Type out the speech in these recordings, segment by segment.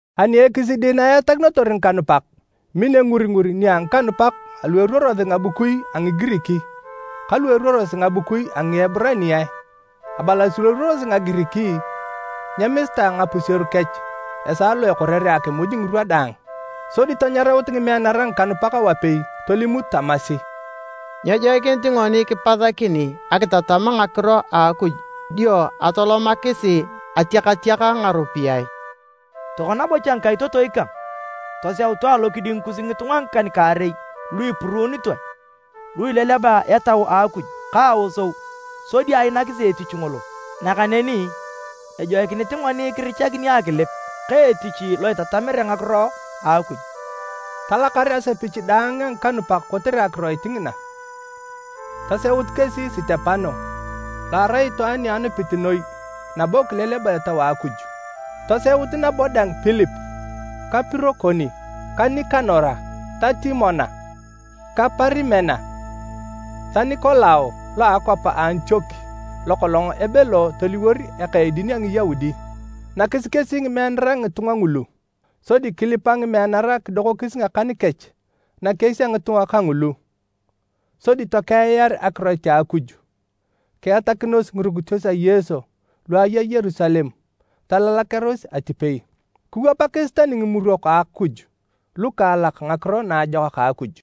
Ani ekisidi na eatakinotor ngikanupak, min enguringur nia ngikanupak alu eruorosi ngabukui a Ngigirik ka lu eruorosi ngabukui a Ngieburaniae. Abalasi lu eruorosi Ngagirik nyemisitae ngapuseru kech esaa lo ekorere akimuj ngirwa daang. Sodi tanyaraut ngimeanara ngikanupak wapei tolimut tamasi, “Nyejoikinit ngoni kipasakini akitatam ngakiro a Akuj dio atolomakisi atiakatiak ngaropiyae. Tokona bocha ngikaitotoi kang, toseutu alokiding kus ngitunga ngikan-kaarei lu ipuruunitoe, lu ileleba Etau a Akuj ka aosou sodi ainakisi etich ngolo. Nakaneni ejoikinit ngoni kirichakini akilip ka etich lo itatamere ngakiro a Akuj.” Talakar asepich daang a ngikanupak kotere akiroit ngina. Toseut kesi Sitepano, lo arai itwaan ni anupit noi nabo kileleba Etau a Akuj. Toseut nabo dang Pilip ka Pirokoni ka Nikanora ka Timona ka Parimena ta Nikolao lo a akwap a Antiok lokolong ebelo toliwor eka edin a Ngiyaudi. Nakis kesi ngimeanara ngitunga ngulu, sodi kilipa ngimeanara kidokokis ngakan kech nakies a ngitunga kangulu. Sodi tokeiar akiroit a Akuj. Kiatakinos ngirukitos a Yesu lu aya Yerusalem talalakearos atipei, kiwapakis tani ngimurok a Akuj lukaalak Ngakiro Naajokak a Akuj.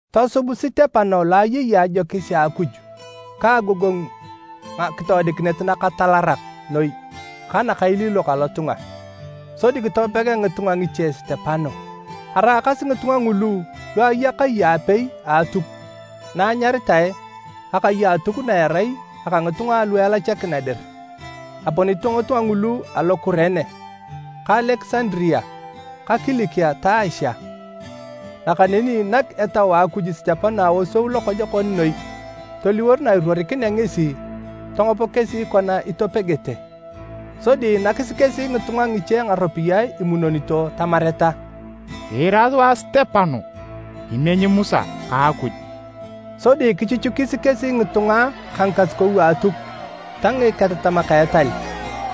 Tosub Sitepano lo ayei ajokis a Akuj ka agogongu ngakitoodikinet nakatalarak noi ka nakailiilok alotunga. Sodi kitopega ngitunga ngiche Sitepano. Araakasi ngitunga ngulu lu aya kai apei a Atuk na anyaritae, “Akai a Atuk na erai aka ngitunga alu Elachakina dir,” aponito ngitunga ngulu alo Kurene ka Alekisandaria ka Kilikia ta Asia. Nakaneni nak Etau a Akuj Sitepano aosou lokojokon noi toliwor na iruorikinea ngesi, tongop kesi kona itopegete. Sodi nakis kesi ngitunga ngiche ngaropiyae imunonito tamareta, “Kiira sua Sitepano imenyi Musa ka Akuj!” Sodi kichuchukis kesi ngitunga ka ngikasukou a Atuk ta ngiketatamak a etal.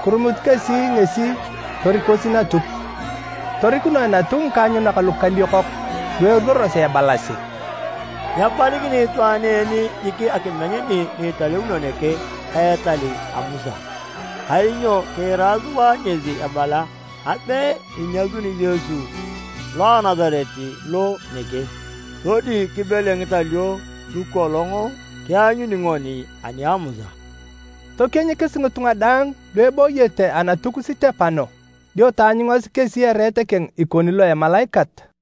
Kirumut kesi ngesi torikosi Natuk. Torikunoe Natuk ngikaanyunak lukaliokok lu eruorosi ebalasi, “Nyepalikini itwaan en jik akimeny ni italeuno nege ka etal a Musa. Kainyo kiira sua ngesi ebala abe inyasuni Yesu lo a Nasaret lo nege, sodi kibele ngitalio lukolong kianyuni ngoni ani a Musa!” Tokienyikis ngitunga daang lu ebooyete Anatuk Sitepano, dio taanyungasi kesi ereet keng ikoni lo emalaikat.